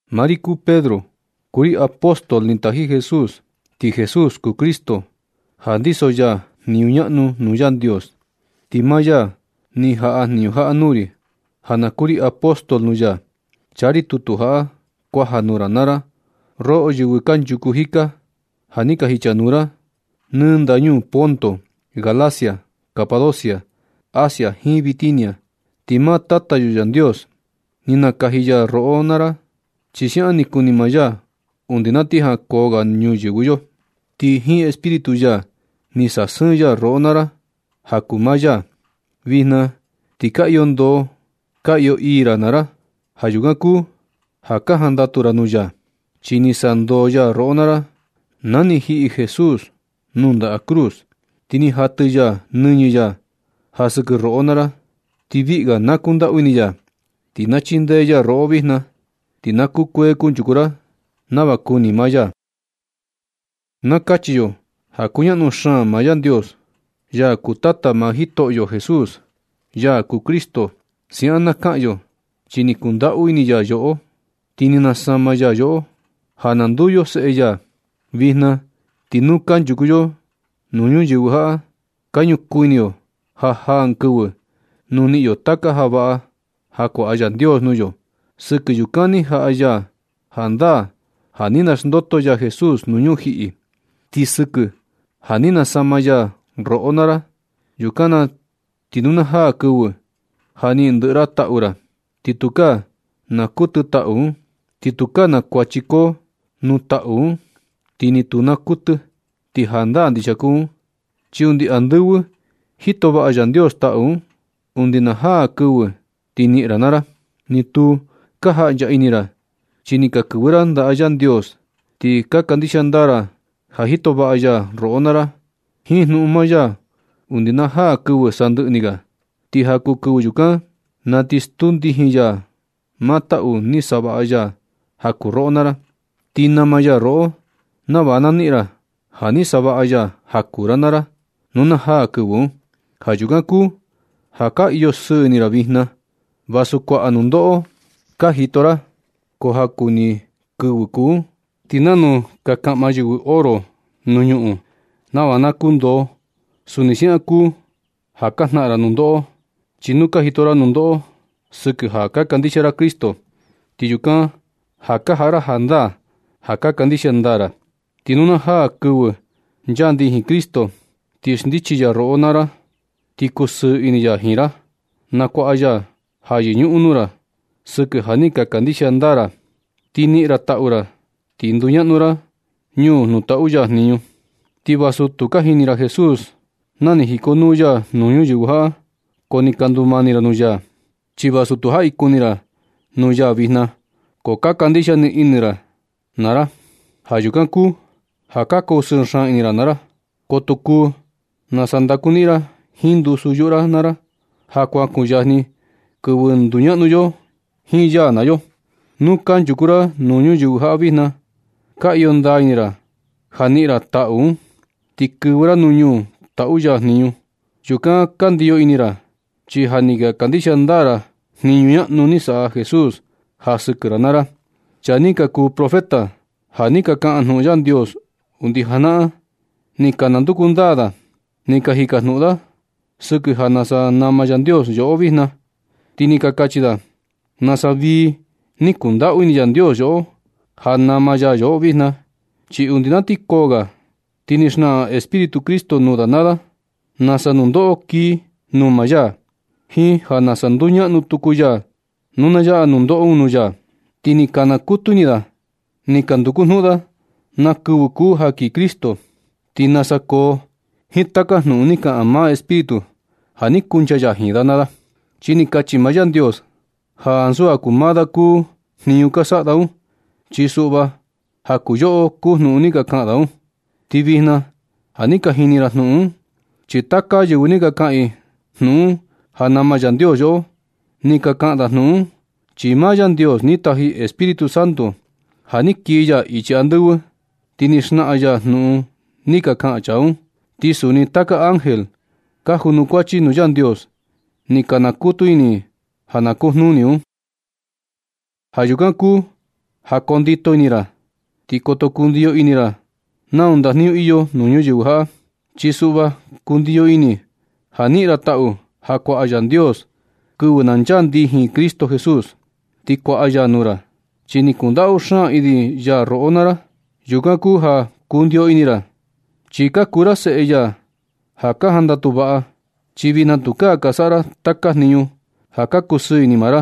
Maa ri kuu Pedro, kuu ri apóstol ni taji Jesús, ti Jesús kuu Cristo, ja ndiso ya jniñu ñaꞌnu nuu Yandios, ti maa ya ni jaꞌa jniñu jaꞌa nuu ri ja na kuu ri apóstol nuu ya. Chaa ri tutu jaꞌa kuaja nuu ra naa ra, roꞌo yɨvɨ kanchuku jika, ja ni ka jichanuu ra nɨ ndañuu Ponto, Galacia, Capadocia, Asia jiin Bitinia. Ti maa Tata yo Yandios ni nakaji ya roꞌo naa ra, chi siaꞌan ni kuni maa ya undi na ti jankoo ga ñuyɨvɨ yo. Ti jiin Espíritu ya ni sasɨɨn ya roꞌo naa ra ja kuu maa ya. Vijna ti ka iyo ndoo ka iyo ii ra naa ra. Ja yukan kuu ja ka jandatu ra nuu ya, chi ni sandoo ya roꞌo naa ra na ni jiꞌi Jesús nuu ndaꞌa cruz, ti ni jatɨ ya nɨñɨ ya ja sɨkɨ roꞌo naa ra. Ti viꞌi ga na kundaꞌu ini ya, ti na chindee ya roꞌo vijna, ti na kukuee kunchuku ra nava kuni maa ya. Na kachi yo ja kuñaꞌnu xaan maa Yandios, Ya kuu Tata maa Jitoꞌo Jesús, ya kuu Cristo. Siaꞌan na kaꞌan yo, chi ni kundaꞌu ini ya yoꞌo, ti ni nasama ya yoꞌo ja na nduu yo seꞌe ya. Vijna ti nu kanchuku yo nuu ñuyɨvɨ jaꞌa, ka ñukuu ini yo ja jaa ɨɨn kɨvɨ nu niꞌin yo taka ja vaꞌa ja kuaꞌa Yandios nuu yo. Sɨkɨ yukan ni jaꞌa ya jandaa ja ni naxndoto ya Jesús nuu ñujiꞌi. Ti sɨkɨ ja ni nasama ya roꞌo naa ra, yukan na ti nu na jaa kɨvɨ ja niꞌin ndɨꞌɨ ra taꞌu ra, ti tukaa naa kuɨtɨ taꞌu un, ti tukaa na kuachi koo nuu taꞌu un, ti ni tu naa kuɨtɨ. Ti jandaa ndixia kuu un, chi undi andɨvɨ jito vaꞌa Yandios taꞌu un, undi na jaa kɨvɨ ti niꞌin ra naa ra. Ni tu ka jaꞌncha ini ra chi ni ka kɨvɨ ra ndaꞌa Yandios, ti ka kandixia ndaa ra ja jito vaꞌa ya roꞌo naa ra jiinjnuꞌun maa ya undi na jaa kɨvɨ sandɨꞌɨ ni ga. Ti ja kuu kɨvɨ yukan, na ti stuu ndijin ya maa taꞌu ni savaꞌa ya ja kuu roꞌo naa ra. Ni nama ya roꞌo nava na niꞌin ra ja ni savaꞌa ya ja kuu ra naa ra, nu na jaa kɨvɨ un. Ja yukan kuu ja ka iyo sɨɨ ini ra vijna vasu kuaꞌa nundoꞌo ka jito ra, ko ja kuu jaku ni kɨvɨ kuu un. Ti nanu ka nakaꞌma yɨvɨ oro nuu ñuꞌun nava na kundoo, suni siaꞌan kuu ja ka jnaꞌan ra nundoꞌo. Chi nu ka jito ra nundoꞌo sɨkɨ ja ka kandixia ra Cristo, ti yukan ja ka jaꞌa ra jandaa ja ka kandixia ndaa ra. Ti nu na jaa kɨvɨ chaa ndijin Cristo, ti xndichi ya roꞌo naa ra ti kusɨɨ ini ya jiin ra. Nakuaꞌa ya ja yɨñuꞌun nuu ra sɨkɨ ja ni ka kandixia ndaa ra ya, ti niꞌin ra, taꞌu ra ti nduñaꞌnu ra ñuu nuu taꞌu ya jniñu. Ti vasu tu ni ka jini ra Jesús na ni jikonuu ya nuu ñuyɨvɨ jaꞌa, ko ni ka ndumani ra nuu ya. Ti vasu tu jaꞌi kuni ra nuu ya vijna, ko ka kandixia nɨ ini ra ya naa ra. Ja yukan kuu ja ka kusɨɨ xaan ini ra naa ra. Ko tu kuu nasa ndakuniꞌin ra jiin ndusu yuꞌu ra naa ra ja ja kuan kuyajni kɨvɨ nduñaꞌnu yo jiin ya naa yo. Nu kanchuku ra nuu ñuyɨvɨ jaꞌa vijna, ka iyo ndaa ini ra ja niꞌin ra taꞌu un, ti kɨvɨ ra ñuu nuu taꞌu ya jniñu. Yukan ka ndiyo ini ra, chi ja ni ka kandixia ndaa ra jniñu ñaꞌnu ni saꞌa Jesús ja sɨkɨ ra naa ra. Chaa ni ka kuu profeta, ja ni ka kaꞌan jnuꞌun Yandios undi janaꞌan, ni ka nanduku ndaa da, ni ka jikajnuꞌun da sɨkɨ ja nasa nama Yandios yoꞌo vijna. Ti ni ka kachi da nasa vii ni kundaꞌu ini Yandios yoꞌo ja nama ya yoꞌo vijna. Chi undi na ti koo ga, ti ni xnaꞌan Espíritu Cristo nuu da naa da nasa nundoꞌo kii nuu maa ya, jiin ja nasa nduñaꞌnu tuku ya nu na yaꞌa nundoꞌo un nuu ya. Ti ni ka nakutu ini da ni ka nduku jnuꞌun da na kɨvɨ kuu ja kii Cristo, ti nasa koo jiin taka jnuꞌun ni kaꞌan maa Espíritu ja ni kuncha ya jiin da naa da. Chi ni kachi maa Yandios ja ansu ja kuu maa da kuu jniñu ka saꞌa da un. Chi suꞌva ja kuu yoꞌo kuu jnuꞌun ni ka kaꞌan da un. Ti vijna ja ni ka jini ra jnuꞌun un, chi taka yɨvɨ ka kaꞌan i jnuꞌun un ja nama Yandios yoꞌo. Ni ka kaꞌan da jnuꞌun un, chi maa Yandios ni taji Espíritu Santo ja ni kii ya ichi andɨvɨ, ti ni xnaꞌan ya jnuꞌun ni ka kaꞌan chaa un. Ti suni taka ángel ka junukuachi nuu Yandios ni ka nakutu ini ja na kujnuni un. Ja yukan kuu ja koo ndito ini naa ra, ti koto kundiyo ini ra nau ndajniñu iyo nuu ñuyɨvɨ jaꞌa. Chi suꞌva kundiyo ini ja niꞌin ra taꞌu ja kuaꞌa Yandios kɨvɨ na chaa ndijin Cristo Jesús. Ti kuaꞌa ya nuu ra, chi ni kundaꞌu xaan ini ya roꞌo naa ra. Yukan kuu ja kundio ini ra, chi ka kuu ra seꞌe ya ja ka jandatu vaꞌa. Chi vijna tukaa ka saꞌa ra taka jniñu ja ka kusɨɨ ini maa ra,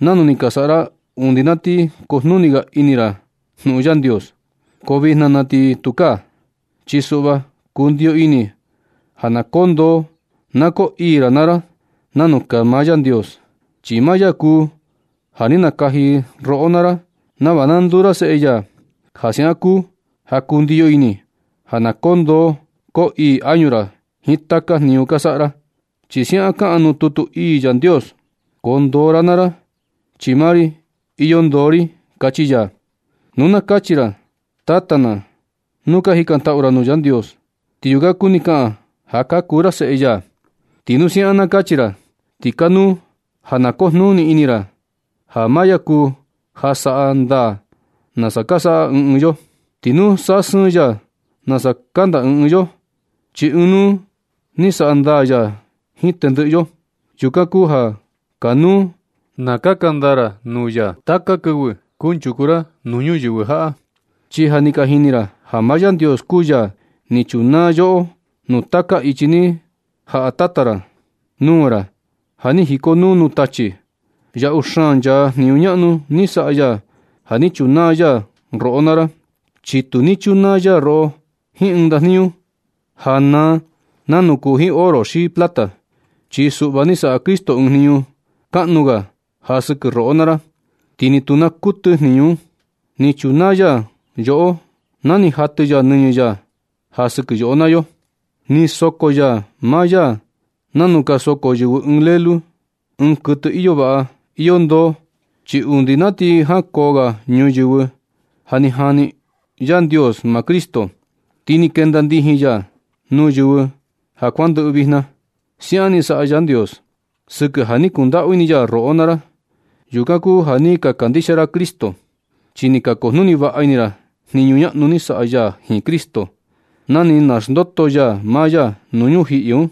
nanu ni ka saꞌa ra undi na ti kujnuni ga ini ra jnuꞌun Yandios. Ko vijna na ti tukaa, chi suꞌva kundiyo ini ja na koo ndoo na koo ii ra naa ra, nanu kaa maa Yandios, chi maa ya kuu ja ni nakaji roꞌo naa ra nava na nduu ra seꞌe ya. Ja siaꞌan kuu ja kundiyo ini ja na koo ndoo, koo ii añu ra jiin taka jniñu ka saꞌa ra. Chi siaꞌan kaꞌan nuu tutu ii Yandios: “Koo ndoo naa ra, chi maa ri iyo ndoo ri”, kachi ya. Nu na kachi ra “Tata na” nuu ka jikantaꞌu ra nuu Yandios, ti yukan kuni kaꞌan ja ka kuu ra seꞌe ya. Ti nu siaꞌan na kachi ra, ti kanuu ja na kujnuni ini ra ja maa ya kuu ja saꞌa ndaa nasa ka saꞌa ɨɨn ɨɨn yo. Ti tu saꞌa sɨɨn ya nasa kanda ɨɨn ɨɨn yo. Chi ɨɨn nuu ni saꞌa ndaa ya jiin tendɨꞌɨ yo. Yukan kuu ja kanuu na kaka ndaa ra nuu ya taka kɨvɨ kunchuku ra nuu ñuyɨvɨ jaꞌa. Chi ja ni ka jini ra ja maa Yandios kuu ya ni chunaa yoꞌo nuu taka ichi ni jaꞌa tata ra nuu ra ja ni jikonuu nuu tachi. Yaꞌu xaan nchaa jniñu ñaꞌnu ni saꞌa ya ja ni chunaa ya roꞌo naa ra, chi tu ni chunaa ya roꞌo jiin ɨɨn ndajniñu ja naa nanu kuu jiin oro xi plata. Chi suꞌva ni saꞌa Cristo ɨɨn jniñu kaꞌnu ga ja sɨkɨ roꞌo naa ra, ti ni tu naa kuɨtɨ jniñu un. Ni chunaa ya yoꞌo na ni jatɨ ya nɨñɨ ya ja sɨkɨ yo naa yo. Ni soko ya maa ya nanu ka soko yɨvɨ ɨɨn lelu, ɨɨn kuɨtɨ iyo vaꞌa, iyo ndoo. Chi undi na ti jankoo ga ñuyɨvɨ ja ni jani Yandios maa Cristo, ti ni kenda ndijin ya nuu kɨvɨ ja kuandɨꞌɨ vijna. Siaꞌan ni saꞌa Yandios sɨkɨ ja ni kundaꞌu ini ya roꞌo naa ra. Yukan kuu ja ni ka kandixia ra Yandios, chi ni ka kujnuni vaꞌa ini ra jniñu ñaꞌnu ni saꞌa ya jiin Cristo, na ni naxndoto ya maa ya nuu ñujiꞌi un,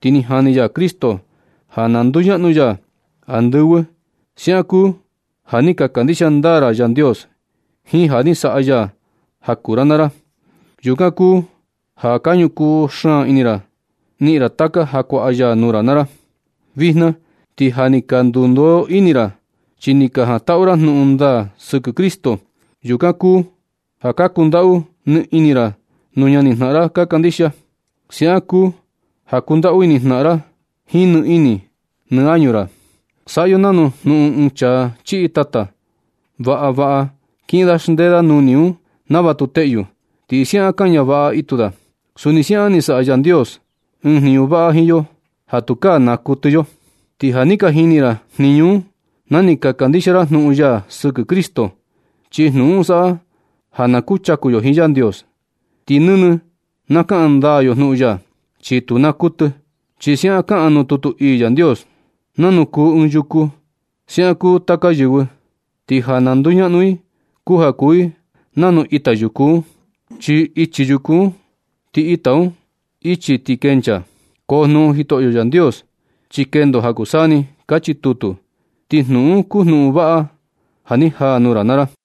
ti ni jani ya Cristo ja na nduñaꞌnu ya andɨvɨ. Siaꞌan kuu ja ni ka kandixia ndaa ra Yandios jiin ja ni saꞌa ya ja kuu ra naa ra. Yukan kuu ja ka ñukuu xaan ini ra niꞌin ra taka ja kuaꞌa ya nuu ra naa ra. Vijna ti ja ni ka ndundoo ini ra chi ni ka jantaꞌu ra jnuꞌun ndaa sɨkɨ Cristo. Yukan kuu ja ka kundaꞌu nɨ ini ra nuu ñani jnaꞌan ra ka kandixia. Siaꞌan kuu ja kundaꞌu ini jnaꞌan naa ra jiin nɨ ini nɨ añu ra. Saꞌa yo nanu jnuꞌun ɨɨn chaa chiꞌi tata, vaꞌa vaꞌa kiꞌin da xndee da nuni un nava tu teꞌyu, ti siaꞌan kaña vaꞌa itu da. Suni siaꞌan ni saꞌa Yandios ɨɨn jniñu vaꞌa jiin yo ja tukaa naa kuɨtɨ yo. Ti ja ni ka niꞌin ra jniñu un na ni ka kandixia ra jnuꞌun ya sɨkɨ Cristo. Chi jnuꞌun un saꞌa ja na kuchaku yo jiin Yandios. Ti nɨnɨ na kaꞌan ndaa yo jnuꞌun ya, chi tu naa kuɨtɨ. Chi siaꞌan kaꞌan nuu tutu ii Yandios: Nanu kuu ɨɨn yuku, siaꞌan kuu taka yɨvɨ. Ti ja na nduñaꞌnu i kuu ja kuu i nanu ita yuku un. Chi ichi yuku un. Ti ita un, ichi ti kenchaa. Ko jnuꞌun Jitoꞌo Yandios, chi kendo ja kuu saa ni. Kachi tutu. Ti jnuꞌun un kuu jnuꞌun vaꞌa ja ni jaa nuu ra naa ra.